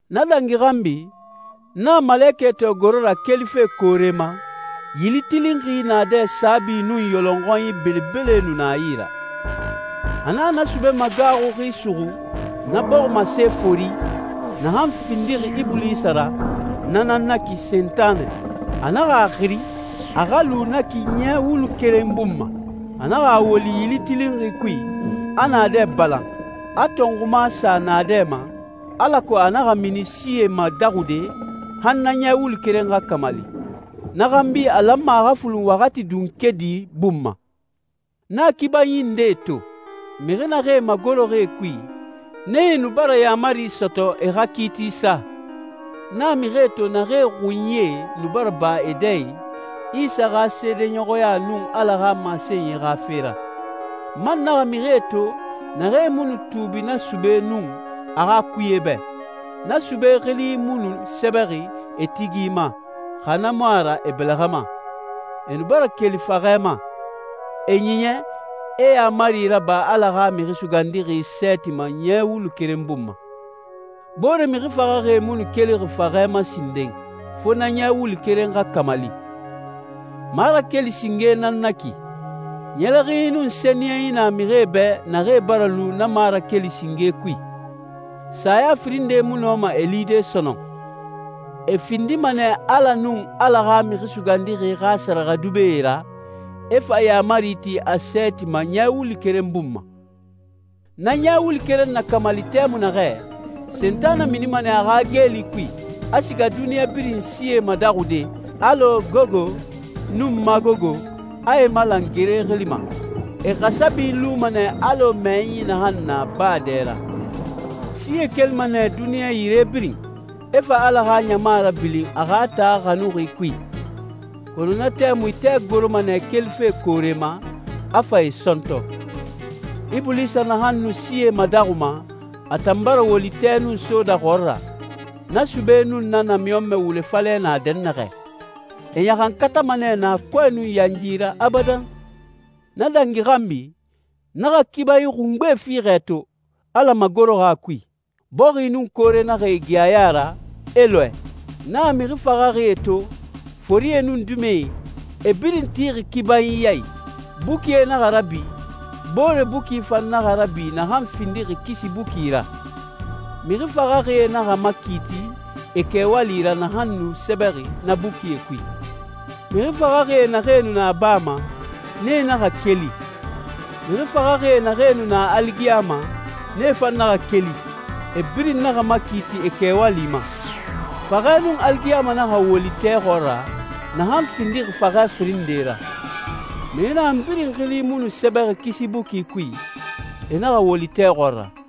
Na dangi xanbi, n naxa malekɛ to goro ra kelife koore ma, yili tilinxi naadɛ saabi nun yɔlɔnxɔnyi belebele nu na a yi ra. A naxa na sube magaaxuxi suxu, na bɔximase fori, naxan findixi Ibulisa ra, na nan na ki Sentanɛ. A naxa a xiri, a xa lu na ki ɲɛ wulu keren bun ma. A naxa a woli yili tilinxi kui, a naadɛ balan, a tɔnxuma sa naadɛ ma, alako a naxa mini sie madaxude han na ɲɛ wulu keren xa kamali. Na xanbi a lanma a xa fulun waxati dunkedi bun ma. N naxa kibanyi ndee to. Mixi naxee magoroxi e kui, nee nu bara yaamari sɔtɔ e xa kiiti sa. N naxa mixie to naxee xunyie nu bara ba e dɛ i Isa xa seedeɲɔxɔya nun Ala xa masenyi xa fe ra. N man naxa mixie to naxee mu nu tuubi na sube nun a xa kuye bɛ, na sube xili mu nu sɛbɛxi e tigi ma, xa na mu a ra e bɛlɛxɛ ma. E nu bara keli faxɛ ma, e ɲiɲɛ, e yaamari raba Ala xa Mixi Sugandixi sɛɛti ma ɲɛ wulu keren bun ma. Boore mixi faxaxie mu nu kelixi faxɛ ma sinden, fo na ɲɛ wulu keren xa kamali. Marakeli singe nan na ki. Ɲɛlɛxinyi nun sɛniyɛnyi na mixie bɛ naxee bara lu na marakeli singe kui. Saya firin nde mu nɔma e lide sɔnɔn. E findima nɛ Ala nun Ala xa Mixi Sugandixi xa sɛrɛxɛdubɛe ra, e fa yaamari ti a sɛɛti ma ɲɛ wulu keren bun ma. Na ɲɛ wulu keren na kamali tɛmui naxɛ, Sentanɛ minima nɛ a xa geeli kui, a siga duniɲa birin sie madaxude, alɔ Gogo nun Magogo, a e malan gere xili ma. E xasabi luma nɛ alɔ mɛyɛnyi naxan na baa dɛ ra. Sie kelima nɛ duniɲa yire birin, e fa Ala xa ɲama rabilin a xa taa xanuxi kui. Kɔnɔ na tɛmui tɛ goroma nɛ kelife koore ma, a fa e sɔntɔ. Ibulisa naxan nu sie madaxuma, a tan bara woli tɛ nun soda xɔɔra, na sube nun na namiɲɔnmɛ wule falɛ na dɛnnaxɛ. E ɲaxankatama nɛ naa kɔɛ nun yanyi ra abadan. Na dangi xanbi, n naxa kibanyi xungbe fiixɛ to, Ala magoroxi a kui. Bɔxi nun koore naxa e gi a ya ra, e lɔɛ. N naxa mixi faxaxie to, forie nun dimɛe, e birin tixi kibanyi ya i. Bukie naxa rabi, boore buki fan naxa rabi naxan findixi kisi buki ra. Mixi faxaxie naxa makiiti e kɛwali ra naxan nu sɛbɛxi na bukie kui. Mixi faxaxie naxee nu na baa ma, nee naxa keli. Mixi faxaxie naxee nu na aligiyama, nee fan naxa keli, e birin naxa makiiti e kɛwali ma. Faxɛ nun aligiyama naxa woli tɛ xɔɔra, naxan findixi faxɛ firin nde ra. Mixi naxan birin xili mu nu sɛbɛxi kisi buki kui, e naxa woli tɛ xɔɔra.